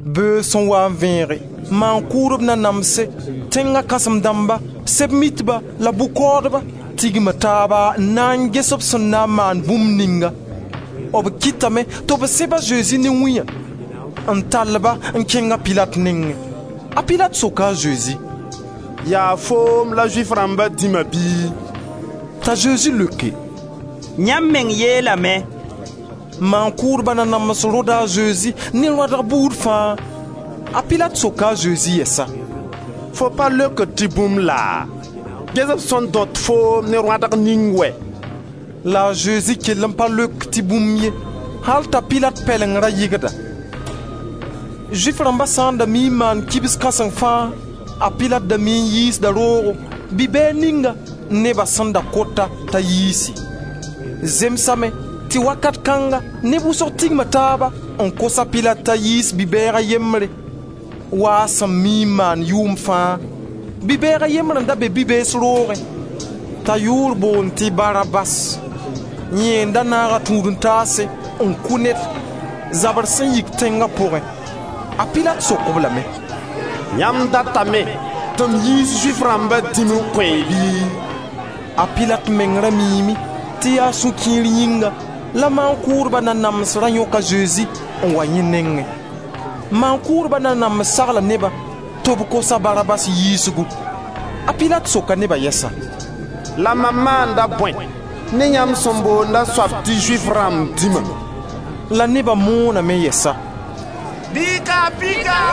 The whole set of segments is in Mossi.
Beoog sẽn waa n vẽege, maan-kʋʋdb nanamse, tẽnga kãsem dãmba, Sɛb-mitba la bʋ-kaoodba tigma taaba n na n ges b sẽn na n maan bũmb ninga. B kɩtame tɩ b sẽb a Zezi ne wĩyã n tall-ba n kẽng a Pilat nengẽ. A Pilat soka a Zezi: «Yaa foom la Zʋɩf rãmba dĩma bɩ?» T'a Zezi leoke: «Yãmb meng yeelame.» Maan-kʋʋdba nanams rõda a Zezi ne rõadg buud fãa. A Pilat soka a Zezi yɛsa: «Fo pa leokd tɩ bũmb laa? Ges b sẽn dõt foo ne rõadg ning wɛ!» La a Zezi kell n pa leok tɩ bũmb ye, al t'a Pilat pɛleng ra yɩgda. Zʋɩf rãmba sã n da mii n maand kibs kãseng fãa, a Pilat da mii n yiisda roogo bi-bɛɛg ninga neba sẽn da kot-a t'a yiisi. Zemsame tɩ wakat kãnga neb wʋsg tigma taab n kos a Pilat t'a yiis bi-bɛɛg a yembre, waa a sẽn mii n maand yʋʋmd fãa. Bi-bɛɛg a yembre n da be bi-beesa roogẽ, t'a yʋʋr boond tɩ Barabas. Yẽ n da naag a tũud-n-taas n kʋ ned, zabr sẽn yik tẽnga pʋgẽ. A Pilat sok-b lame: «Yãmb datame tɩ m yiis Zʋɩf rãmba dĩm n kõ-y bɩ?» A Pilat meng ra miime tɩ yaa sũ-kiir yĩnga la maan-kʋʋdba nanams ra yõk a Zezi n wa yẽ nengẽ. Maan-kʋʋdba nanams sagla neba tɩ b kos a Barabas yiisgu. A Pilat soka neba yɛsa: «La mam maanda bõe ne yãmb sẽn boond a soab tɩ Zʋɩf rãmb dĩma?» La neba mooname yɛsa: «Bɩ y ka-a pika.»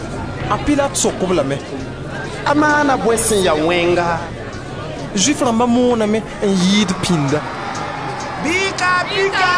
A Pilat sok-b lame: «A maana bõe sẽn ya wẽnga?» Zʋɩf rãmba mooname n yɩɩd pĩnda: «Bɩ y ka-a pika.»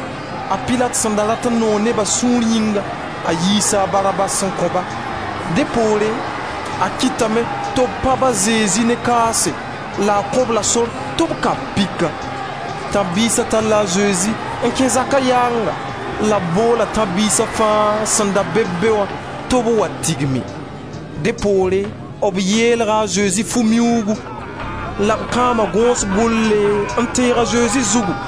A Pilat sẽn da rat n noog neba sũur yĩnga, a yiisa a Barabas n kõ-ba, dẽ poore, a kɩtame tɩ b pãb a Zezi ne kaase la a kõ-b la sor tɩ b ka-b pika. Tãb-biisa talla a Zezi n kẽ zaka yaanga la b boola tãb-biisa fãa sẽn da beb be tɩ b wa tigim. Dẽ poore, b yeelga a Zezi fu-miuugu la b kãama gõos gʋlle n teeg a Zezi zugu.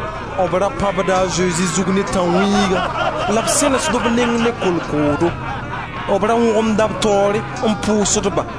B ra pãbda a Zezi zug ne tãnwĩiga la b sẽnesd b neng ne kolkoodo. B ra wõgemda b taoore n pʋʋsd-ba.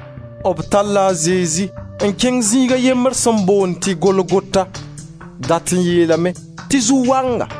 B talla a Zezi n kẽng zĩig a yembr sẽn boond tɩ Golgota. Dat n yeelame tɩ zu-waanga.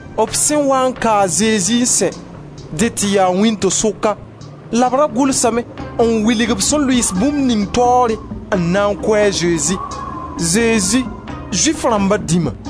B sẽn waa n ka a Zezi n sɛ, dẽ tɩ yaa wĩnto-sʋka la b da gʋlsame n wilg b sẽn lʋɩɩs bũmb ning taoore n na n kʋ a Zezi: «Zezi, Zʋɩf rãmba dĩma.»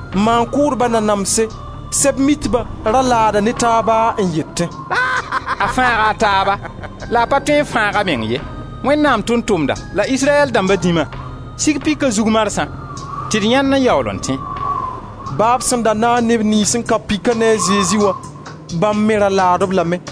Maan-kʋʋdba nanamse, Sɛb-mitba ra laada ne taaba n yetẽ: «A fãaga a taaba la a pa tõe n fãag a meng ye. Wẽnnaam Tʋʋm-tʋmda la Israyɛl dãmba dĩma, sig pika zug marsã tɩ d yãend n yaool n tẽ.» Ba b sẽn da naag neb niyns n ka pika ne a Zezi wã, bãmb me ra laad-b lame.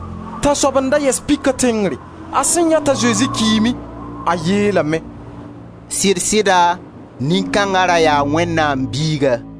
Tãnsoab n da yɛs pika tẽngre. A sẽn yãe t'a Zezi kiime a yeelame: «Sɩd-sɩda nin-kãnga ra yaa Wẽnnaam Biiga.»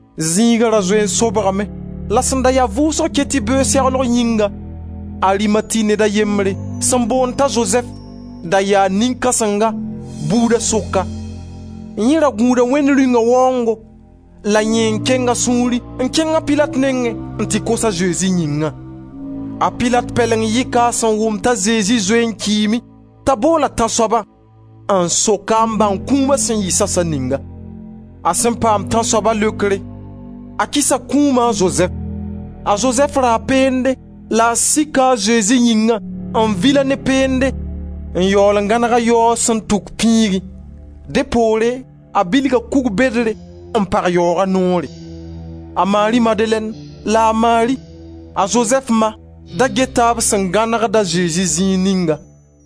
Zĩiga da zoe n sobgame, la sẽn da ya vʋʋsg ket tɩ beoog seglg yĩnga, Arimati ned a yembre sẽn boond t'a Zozɛf, da yaa nin-kãsenga bʋʋdba sʋka. Yẽ ra gũuda Wẽnd Rĩunga waoongo la yẽ n keng a sũuri n kẽng a Pilat nengẽ n tɩ kos a Zezi yĩnga. A Pilat pɛleng yɩka a sẽn wʋm t'a Zezi zoee n kiime t'a bool tãnsoabã n sok-a n bãng kũuma sẽn yɩ sasa ninga. A sẽn paam tãnsoaba leokre, a kɩsa kũuma a Zozɛf. A Zozɛf raa peende la a sika a Zezi yĩnga n vil-a ne peende n yaool n gãneg-a yaoog sẽn tuk pĩigẽ. Dẽ poore, a bilga kug bedre n pag yaooga noore. A Mari Madelɛn la a Mari, a Zozɛf ma, da geta b sẽn gãnegd a Zezi zĩig ningã.